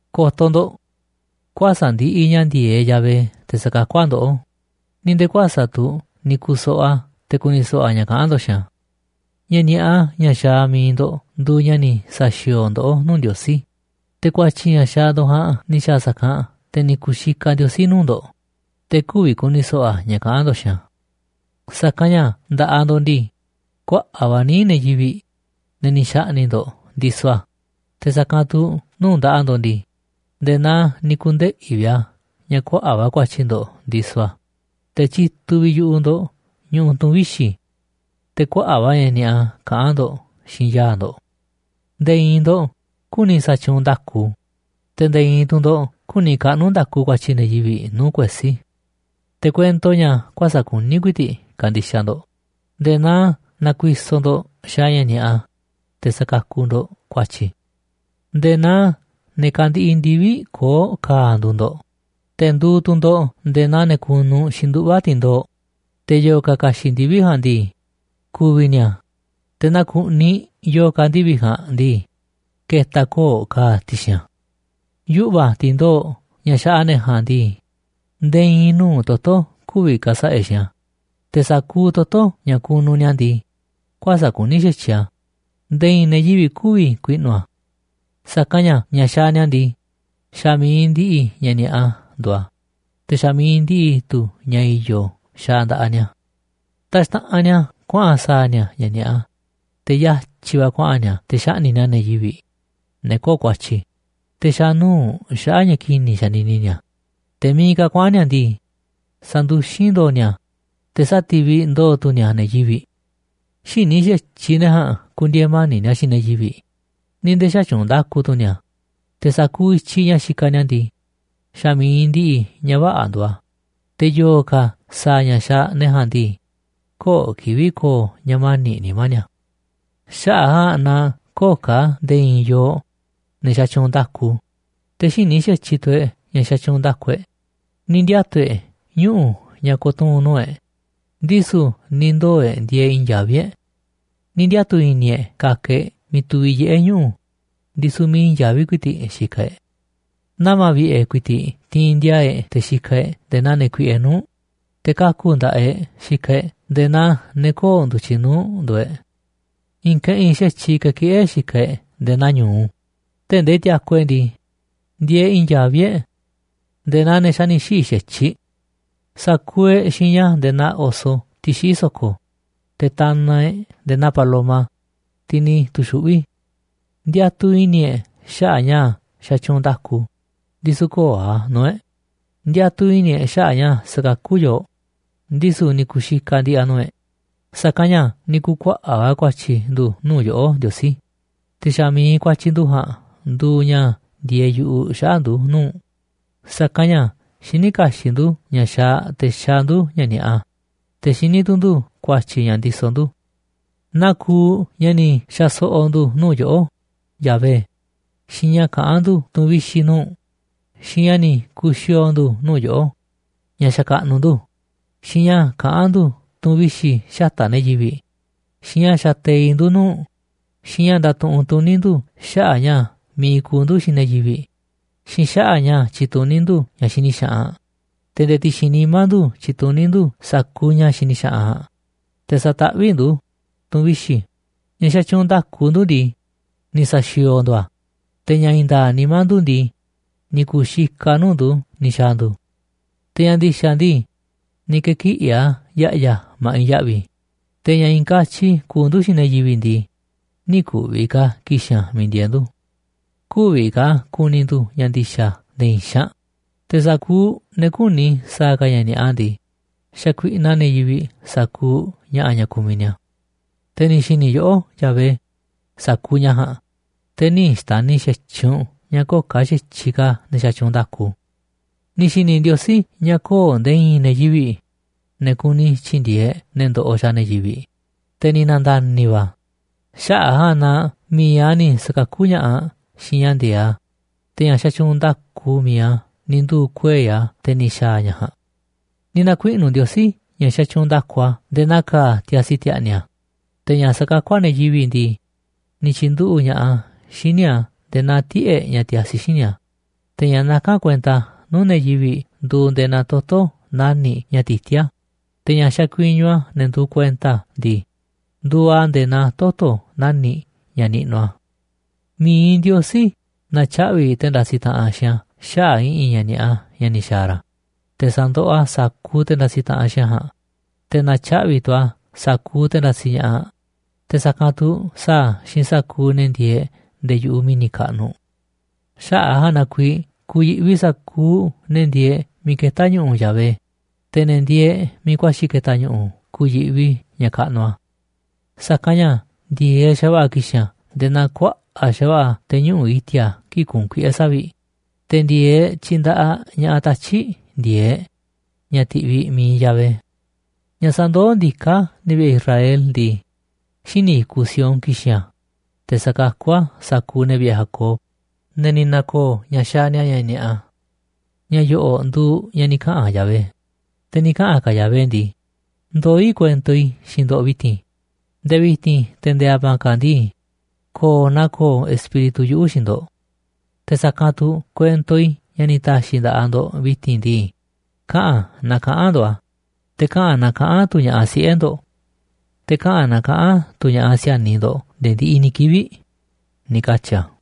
Ko̱to̱ ndo̱ꞌ, kuäsa̱ꞌ ndiꞌiꞌ ña̱ ndi̱e̱eꞌ Yahvé te̱ sa̱kakú a̱ ndoꞌó, ni̱ nde̱e̱ kuäsa̱ꞌ tu̱ ni̱ ku̱soꞌoꞌ a̱ te̱ ku̱ni̱ so̱ꞌo̱ a̱ ña̱ kaꞌán ndo̱ꞌ xiinꞌ a̱. Ña̱ ni̱a̱ꞌa ña̱ xaaꞌ mi̱iꞌ ndo̱ꞌ nduuꞌ ña̱ ni̱ sa̱xi̱o̱o̱ ndoꞌó nuu̱ꞌ Ndiosí. Te̱ ku̱a̱tyi̱ ña̱ xaaꞌ ndo̱ꞌ ja̱a̱nꞌ ni̱ xa̱a̱ sa̱kanꞌ te̱ ni̱ ku̱xikaꞌ Ndiosí nuu̱ꞌ ndo̱ꞌ, te̱ kü̱vi̱ ku̱ni̱ so̱ꞌo̱ a̱ ña̱ kaꞌán ndo̱ꞌ xiinꞌ a̱. Sa̱kanꞌ ña̱ nda̱ꞌaꞌ ndo̱ꞌ ndii, kuaꞌa̱ꞌ va̱ níiꞌ ne̱ yivi̱ꞌ, ne̱ ni̱ xa̱ꞌni̱ꞌ ndo̱ꞌ, ndisoꞌ a̱. Te̱ sa̱kanꞌ tu̱ nuu̱ꞌ nda̱ꞌaꞌ ndo̱ꞌ ndii, nde̱e̱ naa ni̱ ku̱ndeꞌi̱ vi̱ꞌ a̱ ña̱ kuaꞌa̱ꞌ va̱ ku̱a̱tyi̱ ndo̱ꞌ ndisoꞌ a̱. Te̱ tyituꞌ vi̱ꞌ yu̱ꞌuꞌ ndo̱ꞌ ñuꞌuꞌ tu̱n vixi̱, te̱ kuaꞌa̱ꞌ va̱ ña̱ ni̱a̱ꞌa kaꞌán ndo̱ꞌ xiinꞌ yaa̱ꞌ ndo̱ꞌ. Nde̱e̱ i̱i̱n ndo̱ꞌ küni sa̱tyuunꞌ nda̱ku, te̱ nde̱e̱ i̱i̱n tu̱ ndo̱ꞌ küni kaꞌnu̱ nda̱ku ku̱a̱tyi̱ ne̱ yivi̱ꞌ nuu̱ꞌ kuesí. Te̱ kuento ña̱ kuäsa̱ꞌ kuní ku̱i̱ti̱ꞌ kandixaꞌ ndo̱ꞌ nde̱e̱ naa nakuisoꞌ ndo̱ꞌ xaaꞌ ña̱ ni̱a̱ꞌa, te̱ sakakuꞌ ndo̱ꞌ ku̱a̱tyi̱. Nde̱e̱ naa ne̱ kandiꞌiꞌ ndivi̱ꞌ koo̱ꞌ ka̱a̱ nduuꞌ ndo̱ꞌ, te̱ nduuꞌ tu̱ ndo̱ꞌ nde̱e̱ naa ne̱ kunuꞌ xi̱nduꞌva̱ ti̱ndoo̱ꞌ. Te̱ yo̱o̱ ka̱ ka̱xi̱ꞌ ndivi̱ꞌ ja̱a̱nꞌ ndii, ku̱vi̱ ni̱a̱, te̱ naaꞌ ku̱ꞌniꞌ yo̱o̱ ka̱ ndivi̱ꞌ ja̱a̱nꞌ ndii, ke̱ta̱ koo̱ꞌ ka̱a̱ ti̱xi̱n a̱. Yuꞌva̱ ti̱ndoo̱ꞌ ña̱ xaꞌa ne̱ ja̱a̱nꞌ ndii, nde̱e̱ i̱i̱n nuu̱ꞌ toto̱ kü̱vi̱ ka̱sa̱ꞌa̱ e̱ꞌ xiinꞌ a̱. Te̱ sa̱kuuꞌ toto̱ ña̱ kunuꞌ ni̱a̱ ndii, kuäsa̱ꞌ kuní xa̱tyiꞌ a̱ nde̱e̱ i̱i̱n ne̱ yivi̱ꞌ kü̱vi̱ ku̱i̱ꞌnu̱ a̱. Sa̱kanꞌ ña̱ ña̱ xaaꞌ ni̱a̱ ndii, xa̱ mi̱iꞌ ndiꞌiꞌ ña̱ ni̱a̱ꞌa nduuꞌ a̱, te̱ xa̱ mi̱iꞌ ndiꞌiꞌ tu̱ ña̱ i̱yo̱ xaaꞌ nda̱ꞌaꞌ ni̱a̱. Taxtaꞌanꞌ ni̱a̱ kuaꞌa̱n sa̱a̱ ni̱a̱ ña̱ ni̱a̱ꞌa, te̱ yatyi̱ va̱ kuaꞌa̱n ni̱a̱ te̱ xaꞌni̱ꞌ ni̱a̱ ne̱ yivi̱ꞌ, ne̱ köo̱ꞌ ku̱a̱tyi̱. Te̱ xa̱ nuu̱ꞌ xaꞌa̱ꞌ ña̱ ki̱ni̱ xanini ni̱a̱, te̱ miiꞌ ka̱ kuaꞌa̱n ni̱a̱ ndii, sanduxín ndo̱o̱ ni̱a̱, te̱ sáti̱viꞌ ndo̱o̱ tu̱ ni̱a̱ ne̱ yivi̱ꞌ. Xïní xa̱tyiꞌ ne̱ ja̱a̱nꞌ ku̱ndi̱e̱e̱ mani̱ꞌ ni̱a̱ xiinꞌ ne̱ yivi̱ꞌ ni̱ nde̱e̱ xätyuunꞌ nda̱ku tu̱ ni̱a̱. Te̱ sa̱kuuꞌ i̱tyiꞌ ña̱ xikaꞌ ni̱a̱ ndii, xa̱ mi̱iꞌ ndiꞌiꞌ ña̱ vä̱ꞌa̱ nduuꞌ a̱. Te̱ yo̱o̱ ka̱ sa̱a̱ ña̱ xaaꞌ ne̱ ja̱a̱nꞌ ndii, köo̱ꞌ kivi̱ꞌ ko̱o̱ ña̱ mani̱ꞌ nimá ni̱a̱. Xaꞌa̱ꞌ a̱ ja̱a̱nꞌ na köo̱ꞌ ka̱ nde̱e̱ i̱i̱n yooꞌ, ne̱ xatyuunꞌ nda̱ku. Te̱ xïní xa̱tyiꞌ tu̱ e̱ꞌ ña̱ sa̱tyuunꞌ nda̱ku e̱ꞌ. Ni̱ ndiatu̱ e̱ꞌ ñuꞌu̱ ña̱ ko̱tuu̱n nuu̱ꞌ e̱ꞌ, ndisu̱ ni̱ ndoo̱ e̱ꞌ ndieeꞌ i̱i̱n yaví e̱ꞌ. Ni̱ ndiatu̱ i̱ni̱ e̱ꞌ ka̱ka̱ e̱ꞌ miiꞌ tuviꞌ yiꞌé ñuꞌu̱, ndisu̱ miiꞌ i̱i̱n yaví ku̱i̱ti̱ꞌ xikaꞌ e̱ꞌ. Nama̱ vi̱ꞌe̱ ku̱i̱ti̱ꞌ tiinꞌ ndi̱a̱a̱ e̱ꞌ te̱ xikaꞌ e̱ꞌ nde̱e̱ naa ne̱ kuiꞌe nuu̱ꞌ, te̱ kaku̱ nda̱ꞌaꞌ e̱ꞌ xikaꞌ e̱ꞌ nde̱e̱ naa ne̱ köo̱ꞌ ndu̱tyiꞌ nuu̱ꞌ nduuꞌ e̱ꞌ. I̱i̱n keꞌinꞌ xa̱tyiꞌ kekiꞌí e̱ꞌ xikaꞌ e̱ꞌ nde̱e̱ naa ñu̱u tee̱ꞌ ndee tiaku e̱ꞌ ndii, ndieeꞌ i̱i̱n yaví e̱ꞌ nde̱e̱ naa xa̱ ni̱ xiꞌi̱ xa̱tyiꞌ. Sa̱kuuꞌ e̱ꞌ xiña nde̱e̱ naa oso, tiꞌ xiꞌí so̱ko̱, te̱ tanaꞌ e̱ꞌ nde̱e̱ naa paloma, tiꞌ ni̱ tu̱xuꞌví. Ndiatuꞌ i̱ni̱ e̱ꞌ xaꞌa̱ꞌ ña̱ xatyuunꞌ nda̱ku, ndisu̱ köo̱ꞌ a̱ nuu̱ꞌ e̱ꞌ. Ndiatuꞌ i̱ni̱ e̱ꞌ xaꞌa̱ꞌ ña̱ sa̱kakú yooꞌ, ndisu̱ ni̱ ku̱xikaꞌ ndi̱ꞌi̱ a̱ nuu̱ꞌ e̱ꞌ. Sa̱kanꞌ ña̱ ni̱ ku̱kuaꞌa̱ꞌ va̱ ku̱a̱tyi̱ ndu̱ nuu̱ꞌ yoꞌó, Ndiosí, te̱ xa̱ mi̱iꞌ ku̱a̱tyi̱ ndu̱ ja̱a̱nꞌ nduuꞌ ña̱ ndieeꞌ yu̱ꞌuꞌ xaꞌa̱ꞌ ndu̱ nuu̱ꞌ u̱nꞌ. Sa̱kanꞌ ña̱ xiní kaxiꞌ ndu̱ ña̱ xaaꞌ te̱ xaaꞌ ndu̱ ña̱ ni̱a̱ꞌa, te̱ xiní tu̱ ndu̱ ku̱a̱tyi̱ ña̱ ndisoꞌ ndu̱, naa kuuꞌ ña̱ ni̱ xa̱ so̱ꞌo̱ ndu̱ nuu̱ꞌ yoꞌó, Yahvé, xiinꞌ ña̱ kaꞌán ndu̱ tu̱n vixi̱ nuu̱ꞌ u̱nꞌ, xiinꞌ ña̱ ni̱ ku̱xi̱o̱o̱ ndu̱ꞌ nuu̱ꞌ yoꞌó ña̱ xakaꞌnuꞌ ndu̱, xiinꞌ ña̱ kaꞌán ndu̱ tu̱n vixi̱ xata̱ꞌ ne̱ yivi̱ꞌ, xiinꞌ ña̱ xateiꞌ ndu̱ nuu̱ꞌ u̱nꞌ, xiinꞌ ña̱ ndatuꞌunꞌ tuní ndu̱ xaꞌa̱ꞌ ña̱ mi̱iꞌ kuuꞌ ndu̱ xiinꞌ ne̱ yivi̱ꞌ, xiinꞌ xaꞌa̱ꞌ ña̱ tyituní ndu̱ ña̱ xini xaꞌanꞌ. Te̱ nde̱e̱ ti̱xi̱n nimá ndu̱ tyituní ndu̱ sa̱kuuꞌ ña̱ xini xaꞌanꞌ ja̱a̱nꞌ, te̱ sataꞌvíꞌ ndu̱ tu̱n vixi̱. Ña̱ xatyuunꞌ nda̱ku ndu̱ ndii, ni̱ sa̱xi̱o̱o̱ ndu̱ a̱, te̱ ña̱ i̱i̱n nda̱a̱ꞌ nimá ndu̱ ndii, ni̱ ku̱u̱ xikaꞌ a̱ nuu̱ꞌ ndu̱ ni̱ xa̱a̱ ndu̱. Te̱ ña̱ ndi̱xa̱ ndii, ni̱ ke̱kiꞌi̱ a̱ ya̱ꞌya̱ ma̱ꞌiꞌ ya̱ꞌvi̱. Te̱ ña̱ i̱i̱n katyi kuuꞌ ndu̱ xiinꞌ ne̱ yivi̱ꞌ ndii, nï̱ ku̱vi̱ ka̱ ki̱xi̱n a̱ miiꞌ ndieeꞌ ndu̱. Kü̱vi̱ ka̱ ku̱ni̱ ndu̱ ña̱ ndi̱xa̱ nde̱e̱ i̱i̱n xaanꞌ. Te̱ sa̱kuuꞌ ne̱ küni sa̱a̱ ka̱ ña̱ ni̱a̱ꞌa ndii, xakuiꞌnaꞌ ne̱ yivi̱ꞌ sa̱kuuꞌ ña̱ꞌa̱ ña̱ kumiꞌ ni̱a̱. Te̱ ni̱ xi̱ni̱ yoꞌó, Yahvé, sa̱kuuꞌ ña̱ ja̱a̱nꞌ, te̱ nï̱ xtani̱ xa̱tyiꞌ u̱nꞌ ña̱ köo̱ꞌ ka̱ xa̱tyiꞌ ka̱ ne̱ xatyuunꞌ nda̱ku. Ni̱ xi̱ni̱ Ndiosí ña̱ köo̱ꞌ nde̱e̱ i̱i̱n ne̱ yivi̱ꞌ, ne̱ kuni tyi̱ndi̱e̱eꞌ ne̱ ndoꞌoꞌ xaaꞌ ne̱ yivi̱ꞌ. Te̱ ni̱ na̱nda̱ni̱ va̱ a̱ xaꞌa̱ꞌ a̱ ja̱a̱nꞌ na mi̱iꞌ a̱ ni̱ sa̱kakú ña̱ꞌaꞌ xiinꞌ ña̱ ndi̱e̱eꞌ a̱. Te̱ ña̱ xatyuunꞌ nda̱ku mi̱iꞌ a̱ ni̱ nduu̱ kuei̱ a̱ te̱ ni̱ xa̱a̱ ña̱ ja̱a̱nꞌ. Ni̱ na̱kuiꞌnu̱ Ndiosí ña̱ xatyuunꞌ nda̱ku a̱ nde̱e̱ naa ka̱a̱ tiasi ti̱a̱ꞌni̱ a̱. Te̱ ña̱ sakakú a̱ ne̱ yivi̱ꞌ ndii, ni̱ tyi̱nduꞌu̱ꞌ ña̱ꞌaꞌ a̱ xíniꞌ a̱ nde̱e̱ naa tiꞌe̱ꞌ ña̱ tiasi xíniꞌ a̱. Te̱ ña̱ nakán kuenta nuu̱ꞌ ne̱ yivi̱ꞌ nduuꞌ nde̱e̱ naa toto̱ nani̱ꞌ ña̱ tití a̱. Te̱ ña̱ xakuiñu a̱ ne̱ nduuꞌ kuenta a̱ ndii, nduuꞌ a̱ nde̱e̱ naa toto̱ nani̱ꞌ ña̱ niꞌnuꞌ a̱. Mi̱iꞌ Ndiosí na̱tyaꞌvi̱ te̱ ndasiꞌ taꞌanꞌ xiinꞌ a̱ xaꞌa̱ꞌ i̱ꞌi̱n ña̱ ni̱a̱ꞌa ña̱ ni̱ xa̱a̱ ra̱. Te̱ sa̱ndoꞌoꞌ a̱ sa̱kuuꞌ te̱ ndasiꞌ taꞌanꞌ xiinꞌ a̱ ja̱a̱nꞌ. Te̱ na̱tyaꞌvi̱ tu̱ a̱ sa̱kuuꞌ te̱ ndasiꞌ ña̱ꞌaꞌ, te̱ sa̱kanꞌ tu̱ sa̱a̱ a̱ xiinꞌ sa̱kuuꞌ ne̱ ndieeꞌ nde̱e̱ yu̱ꞌuꞌ mi̱ni̱ kaꞌnuꞌ. Xaꞌa̱ꞌ a̱ ja̱a̱nꞌ na kuiiꞌ ku̱yi̱ꞌvi sa̱kuuꞌ ne̱ ndieeꞌ miiꞌ ketá ñu̱ꞌu̱ Yahvé, te̱ ne̱ ndieeꞌ miiꞌ ku̱a̱xi̱ ke̱ta̱ ñu̱ꞌu̱ ku̱yi̱ꞌvi ña̱ kaꞌnuꞌ a̱. Sa̱kanꞌ ña̱ ndi̱e̱eꞌ xa̱va̱ꞌa̱ ki̱xi̱n a̱ nde̱e̱ naa kuaꞌa̱ꞌ xa̱va̱ꞌa̱ te̱ ñuꞌu̱ꞌ i̱ti̱a̱ kii̱ꞌ kuunꞌ kuiꞌe̱ savi̱ꞌ, te̱ ndi̱e̱eꞌ tyindaꞌaꞌ ña̱ꞌaꞌ tatyi̱ꞌ ndi̱e̱eꞌ ña̱ tiꞌviꞌ mi̱iꞌ Yahvé. Ña̱ sandoó ndiká ne̱ vi̱ꞌe̱ Israel ndii, xíniꞌ i̱kuꞌ Sión ki̱xi̱n a̱, te̱ sakakú a̱ sa̱kuuꞌ ne̱ vi̱ꞌe̱ Jacob, ne̱ ni̱ na̱ko̱o̱ ña̱ xaaꞌ ni̱a̱ ña̱ ni̱a̱ꞌa. Ña̱ yo̱ꞌo̱ꞌ nduuꞌ ña̱ ni̱ kaꞌa̱n Yahvé. Te̱ ni̱ kaꞌa̱n ka̱ Yahvé ndii: “Ndoó i̱ kuento i̱ xiinꞌ ndo̱ꞌ vi̱ti̱n. Nde̱e̱ vi̱ti̱n te̱ nde̱e̱ a̱ma̱a̱ ka̱ ndii, ko̱o̱ naa ko̱o̱ Espíritu yuꞌu̱ xiinꞌ ndo̱ꞌ. Te̱ sa̱kanꞌ tu̱ kuento i̱ ña̱ ni̱ ta̱xi̱ i̱ nda̱ꞌaꞌ ndo̱ꞌ vi̱ti̱n ndii, kaꞌa̱n naa kaꞌa̱n ndo̱ꞌ a̱, te̱ kaꞌa̱n naa kaꞌa̱n tu̱ ña̱ꞌaꞌ siꞌe̱ ndo̱ꞌ, te̱ kaꞌa̱n naa kaꞌa̱n tu̱ ña̱ꞌaꞌ si̱a̱niꞌ ndo̱ꞌ nde̱e̱ ndiꞌiꞌ ni̱ kivi̱ꞌ”, ni̱ katyi̱ a̱.